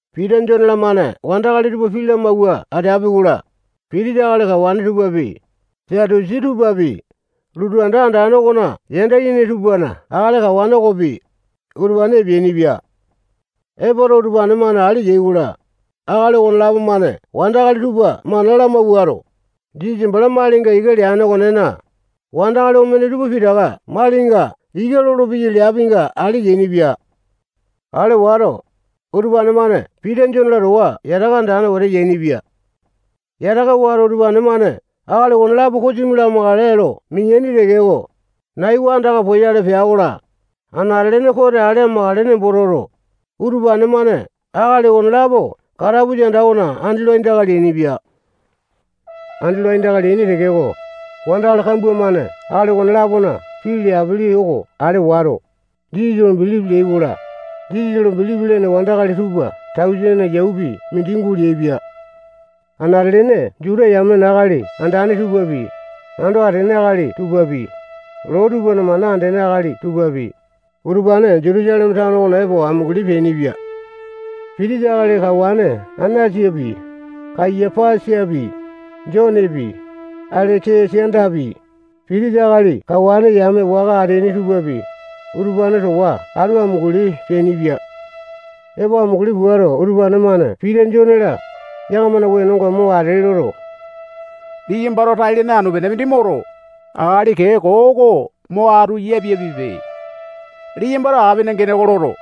Pita, Jone-lamane wandakali tupa pii lamawua ateapi-kola, pitisa akali tupapi, Satusi tupapi, lotu anda andane okona yanda yene tupana akali kawane okopi, utupane epeanipia. Epoto, utupane-mane ale yai-kola, akali okonelapo-mane wandakali tupa mana lamawuato, Jisasa bala malinga ika leane okonena, wandakali omene tupa pitaka malinga ika lolopeyai leapinga ale yainipia. Ale wato, utupane-mane Pita, Jone-la, towa yataka andane wete yainipia. Yataka wato, utupane-mane akali okonelapo kosimi lamakale lo mineaini tekeko, nai oko andaka poyale pea-kola, anate-lene kote ale amakale nembo toto, utupane-mane akali okonelapo katapusa anda okona andi lo aindaka leainipia. Andi lo aindaka leaini tekeko, wandakali kambua-mane akali okone-lapona pii leapili oko ale wato, Jisasa lo bilipi leai-kola, Jisasa lo bilipi lene wandakali tupa tausene yaupi mindi guleaipia. Anate-lene Juta yamena akali andane tupapi, ando atene akali tupapi, loo tupana mana andene akali tupapi, utupane Jutusaleme tano okona epo amunguli peainipia. Pitisa akali kawane Anasapi, Kayapasapi, Jonepi, Aleke-sandapi, pitisa akali kawane yame waka ateaini tupapi, utupane towa atu amunguli peainipia. Epo amunguli puato, utupane-mane Pita, Jone-la, yakamana wenonga mo ate loto, liyambato tai-lene anu-pene mindi moto, akali kee koo oko mo atu yapiapipe. Liyambato apina gene oko loto,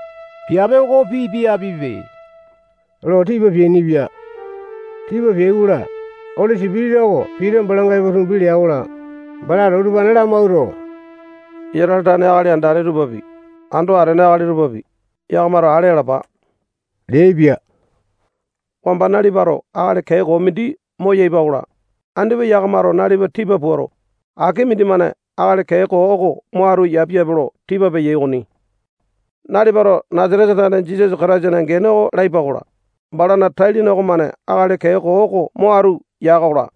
piape oko pipiapipe lo tipa peainipia. Tipa peai-kola, Oli Sipitisa oko Pita balanga epo tumbi lea-kola, balato utupane lamawuato, Isatale tane akali andane tupapi, ando atene akali tupapi, yakamato ale alapa leaipia. Wamba nalipato akali kee koo mindi moyaipa-kola, andipa yakamato nalipa tipa puato, aki mindimane akali kee koo oko mo atu yapiapipe lo tipa peyai okoni. Nalipato Nasatesa tane Jisasa Kataisana gene oko laipa-kola, balana tai-lene okomane akali kee koo oko mo atu ya-kola,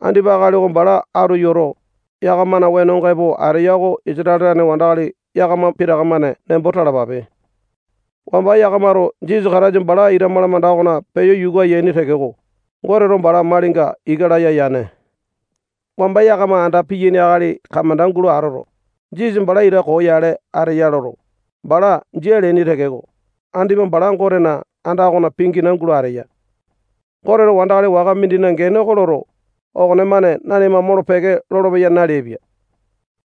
andipa akali oko bala atu yoto, yakamana wenonga epo ateya oko Isatale tane wandakali yakama pitaka-mane nembo talapape. Wamba yakamato Jisasa Kataisa bala ita malamanda okona peyo yuka yaini tekeko, Goteto bala malinga ika laya yane. Wamba yakama anda piyaini akali kamanda gulo atoto, Jisasa bala ita koo yale ateya ya loto, bala jia leaini tekeko, andipa bala Gotena anda okona pingina gulo ateya. Goteto wandakali waka mindina gene oko loto, okonemane nanima molo-peke lolopeya naleaipia.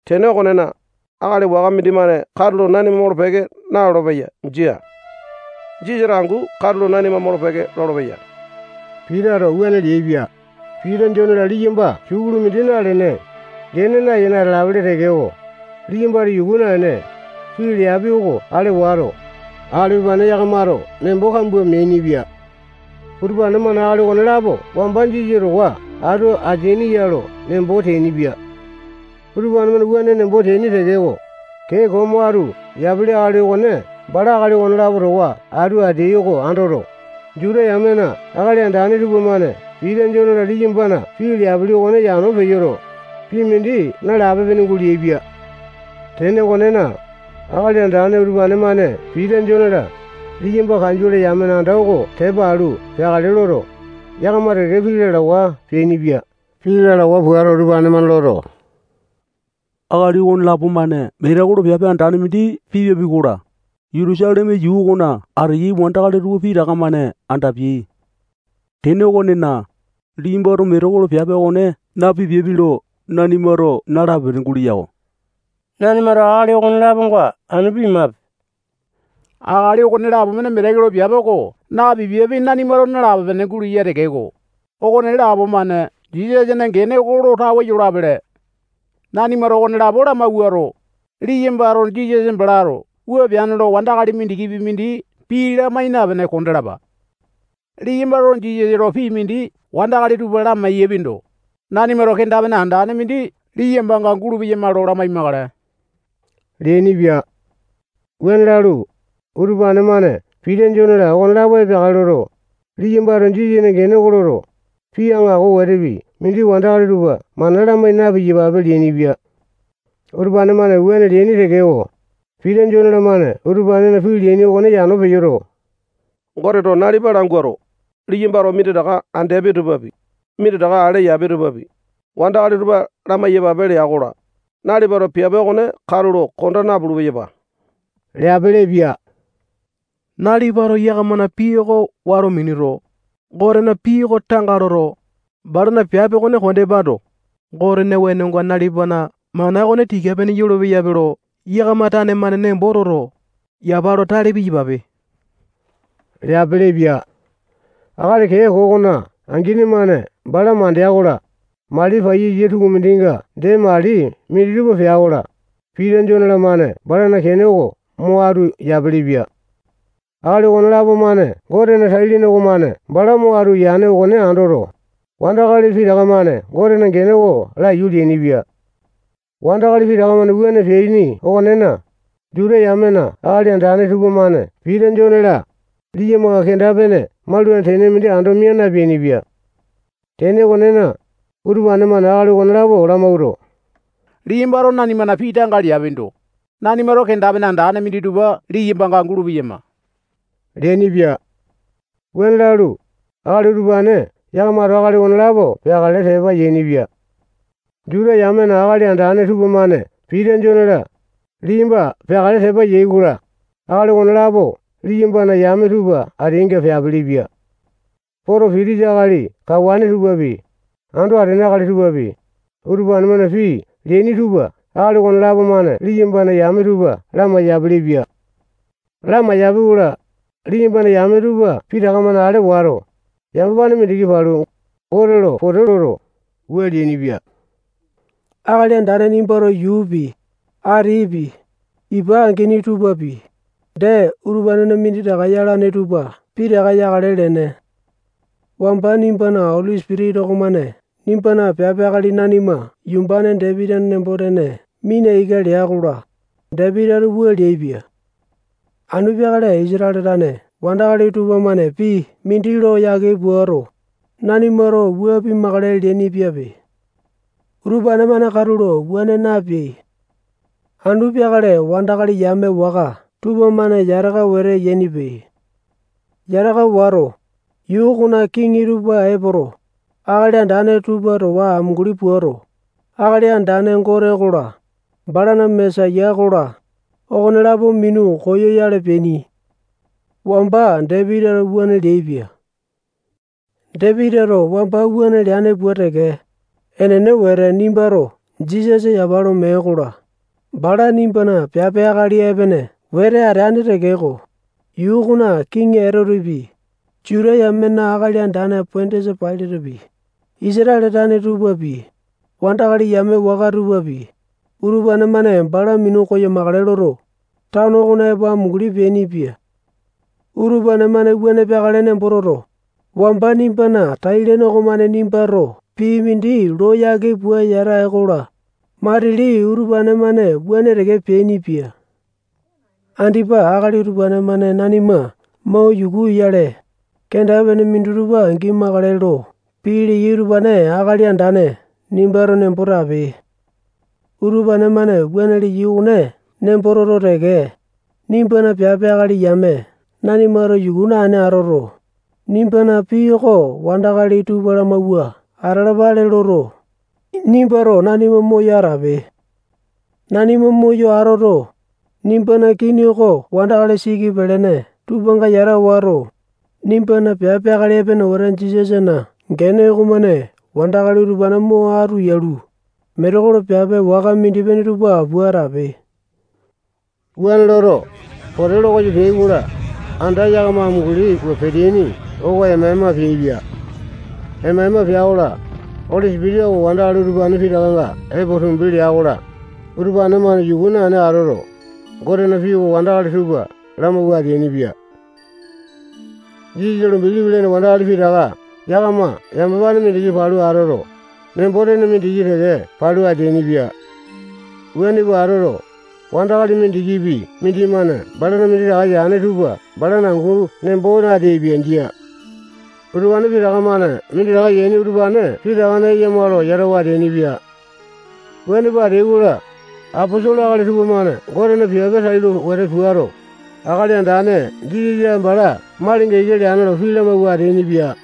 Tene okonena, akali waka mindimane katulo nanima molo-peke nalolo-peya. Jia. Jisasato angu katulo nanima molo-peke lolopeya. Pitato wuane leaipia. Pita, Jone-la, liyamba sukulu mindi nalene, gene nayene ateapele tekeko, liyambato yuku naene, pii leapi oko ale wato, akali utupane yakamato nembo kambua meainipia. Utupane-mane akali okonelapo wamba Jisasa towa atu ateaini ya lo nembo teainipia. Utupane-mane wuane nembo teaini tekeko, kee koo mo atu yapili akali okone bala akali okonelapo towa atu ateai oko andoto, Juta yamena akali andane tupamane Pita, Jone-la, liyambana pii leapili okone yano peyo, pii mindi nalape-pene guleaipia. Tene okonena, akali andane utupane-mane Pita, Jone-la, liyamba kanjole yamena anda oko tepa alu peakale loto, yakama teke-teke pii lalawa peainipia. Pii lalawa puato, utupane-mane loto, akali okonelapo-mane metekolo piape andane mindi pipiapi-kola, Jutusaleme yuu okona ateyai wandakali tupa pitaka-mane andapiai. Tene okonena, liyambato metekolo piape okone napipiapi lo nanimato nalape-pene guleya-ko. Nanimato akali okone-laponga anu pimape. Akali okonelapo-mane metekolo piape oko napipiapi nanimato nalape-pene guleya tekeko, okonelapo-mane Jisasana gene oko lo tawe yolapele. Nanimato okonelapo lamawuato, liyambato Jisasa balato wua peane lo wandakali mindikipi mindi pii lamai napene kondalapa. Liyambato Jisasa lo pii mindi wandakali tupa lamai-yapindo, nanimato kenda-pene andane mindi liyambanga gulu-peyama lo lamai-makale leainipia. Wuane lalu, utupane-mane Pita, Jone-la, okonelapo epeakale loto, liyambato Jisasana gene oko loto, pii aŋako wetepi mindi wandakali tupa mana lamai na-piyapape leainipia. Utupane-mane wuane leaini tekeko, Pita, Jone-lamane utupanena pii leaini okone yano peyoto, Goteto nalipa languato, liyambato minditaka andeapi tupapi, minditaka ale yapi tupapi, wandakali tupa lamai-yapape lea-kola, nalipato piape okone katulo konda napulu-peyapa leaipili-pia. Nalipato yakamana pii oko wato minuto, Gotena pii oko tanga loto, balana piape okone kondepando, Gotena wenonga nalipana mana okone tika-pene yolo-peyape lo yakama tane-mane nembo toto, yapa lo tale piyapape leapilipia. Akali kee koo okona angini-mane bala mandea-kola, mali paiyasa tukumindinga dee mali minditupa pea-kola, Pita, Jone-lamane balana kene oko mo atu yapilipia. Akali okonelapo-mane Gotena tai-lene okomane bala mo atu yane okone andoto, wandakali pitaka-mane Gotena gene oko laiyu leainipia. Wandakali pitaka-mane wuane peaini okonena, Juta yamena akali andane tupamane Pita, Jone-la, liyambanga kenda-pene maulane tene mindi ando mia napeainipia. Tene okonena, utupane-mane akali okonelapo lamawuato, liyambato nanimana pii tanga leapindo, nanimato kenda-pene andane minditupa liyambanga gulu-peyama leainipia. Wuane lalu, akali utupane yakamato akali okonelapo peakale tepa yainipia. Juta yamena akali andane tupamane Pita, Jone-la, liyamba peakale tepa yai-kola, akali okonelapo liyambana yame tupa ateainga peapilipia. Poto, pitisa akali kawane tupapi, ando atene akali tupapi, utupane-mane pii leaini tupa akali okonelapo-mane liyambana yame tupa lamai-yapelepia. Lamaiyapi-kola, liyambana yame tupa pitaka-mane ale wato, yamapane mindiki palu, Gote lo pote loto, wua leainipia. Akali Andane nimbato yuupi, atipi, ipa angini tupapi, dee utupanena minditaka yalane tupa pitaka yakale leene. Wamba nimbana Oli Sipitisa okomane nimbana piape akali nanimana yumbane Dapitina nembo-tene mina ika lea-kola, Dapitito wua leaipia: Anu peakale Isatale tane wandakali tupamane pii mindi lo yake puato, nanimato wua pimakale leaini-piape. Utupane-mane katulo wuane napeai. Anu peakale wandakali yame waka tupamane yataka wete yainipe. Yataka wato, yuu okona kiŋi tupa epoto, akali andane tupa towa amunguli puato, Akali Andane Gote okola, balana Mesaya okola, okonelapo minu koyoyale peaini. Wamba Dapitito wuane leaipia. Dapitito wamba wuane leane pua teke, enene wete nimbato Jisasa yapa lo mee-kola, bala nimbana piape akali epene wete ateane tekeko, yuu okona kiŋi Etotepi, Juta yamena akali andane Pondiasa Pailatepi, Isatale tane tupapi, wandakali yame waka tupapi, utupane-mane bala minu koyamakale loto, tano okona epo amunguli peainipia. Utupane-mane wuane peakale nembo toto, wamba nimbana tai-lene okomane nimbato pii mindi lo yake pua yata ee-kola, matili utupane-mane wuane teke peainipia. Andipa akali utupane-mane nanima mo yuku oyale, kenda-pene minditupa gimakale lo pii leyai utupane Akali Andane nimbato nembo tape. Utupane-mane wuane leyai okone nembo toto teke, nimbana piape akali yame nanimato yuku naene atoto, nimbana pii oko wandakali tupa lamawua atalapale loto, nimbato nanima moyo atape. Nanima moyo atoto, nimbana kini oko wandakali siki pelene tupanga yata wato, nimbana piape akali epene wete Jisasana gene okomane wandakali utupane mo atu yalu, metekolo piape waka mindi-pene tupa pua atape. Wuane loto, pote lo koyo peai-kola, anda yakama amunguli pua peteaini oko ema-ema peaipia. Ema-ema pea-kola, Oli Sipitisa oko wandakali utupane pitakanga epo tumbi lea-kola, utupane-mane yuku naene atoto, Gotena pii oko wandakali tupa lamawua ateainipia. Jisasa lo bilipi lene wandakali pitaka yakama yamapane mindiki palu atoto, nembo-tene mindiki teke palu ateainipia. Wuane pua atoto, wandakali mindikipi mindimane balana minditaka yane tupa balana angu nembo nateaipia. Jia. Utupane pitaka-mane minditaka yaini utupane pitakana eyama lo yatawa ateainipia. Wuane pua ateai-kola, aposolo akali tupamane Gotena piape tailo wete puato, Akali Andane Jisasa bala malinga ika leane lo pii lamawua ateainipia.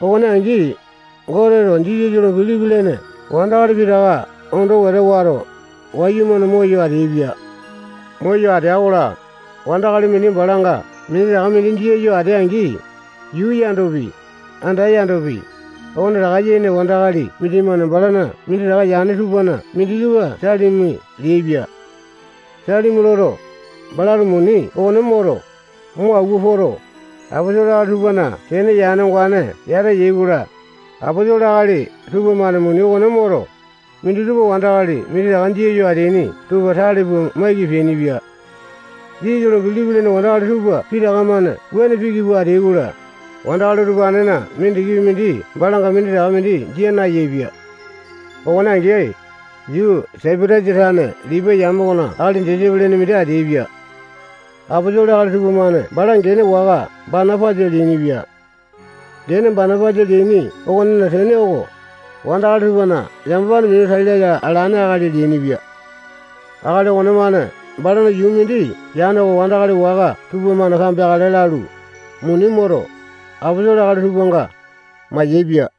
Okone angi, Goteto Jisasa lo bilipi lene wandakali pitaka ondo wete wato, wayumane moyo ateaipia. Moyo atea-kola, wandakali mindi balanga minditaka mindi jia yo atea-angi, yuu yandopi, anda yandopi, okonetaka yene wandakali mindimane balana minditaka yane tupana minditupa salimi leaipia. Salimi loto, balato muni okone moto, mo awua poto, aposolo akali tupana kene yane ongane yata yai-kola, aposolo akali tupamane muni okone moto, minditupa wandakali minditaka jia yo ateaini tupa tale pua maiki peainipia. Jisasa lo bilipi lene wandakali tupa pitaka-mane wuane piki pua ateai-kola, wandakali utupanena mindikipi mindi balanga minditaka mindi jia nayaepia. Okone angi, yuu Saipatasa tane Lipai yame okona akali Josepe lene mindi ateaipia. Aposolo akali tupamane bala gene waka Banapasa leainipia. Gene Banapasa leaini okonena tene oko, wandakali tupana yamapane minu tai laya alane akali leainipia. Akali okonemane balana yuu mindi yane oko wandakali waka tupamane kambeakale lalu, muni moto, aposolo akali tupanga mayaepia.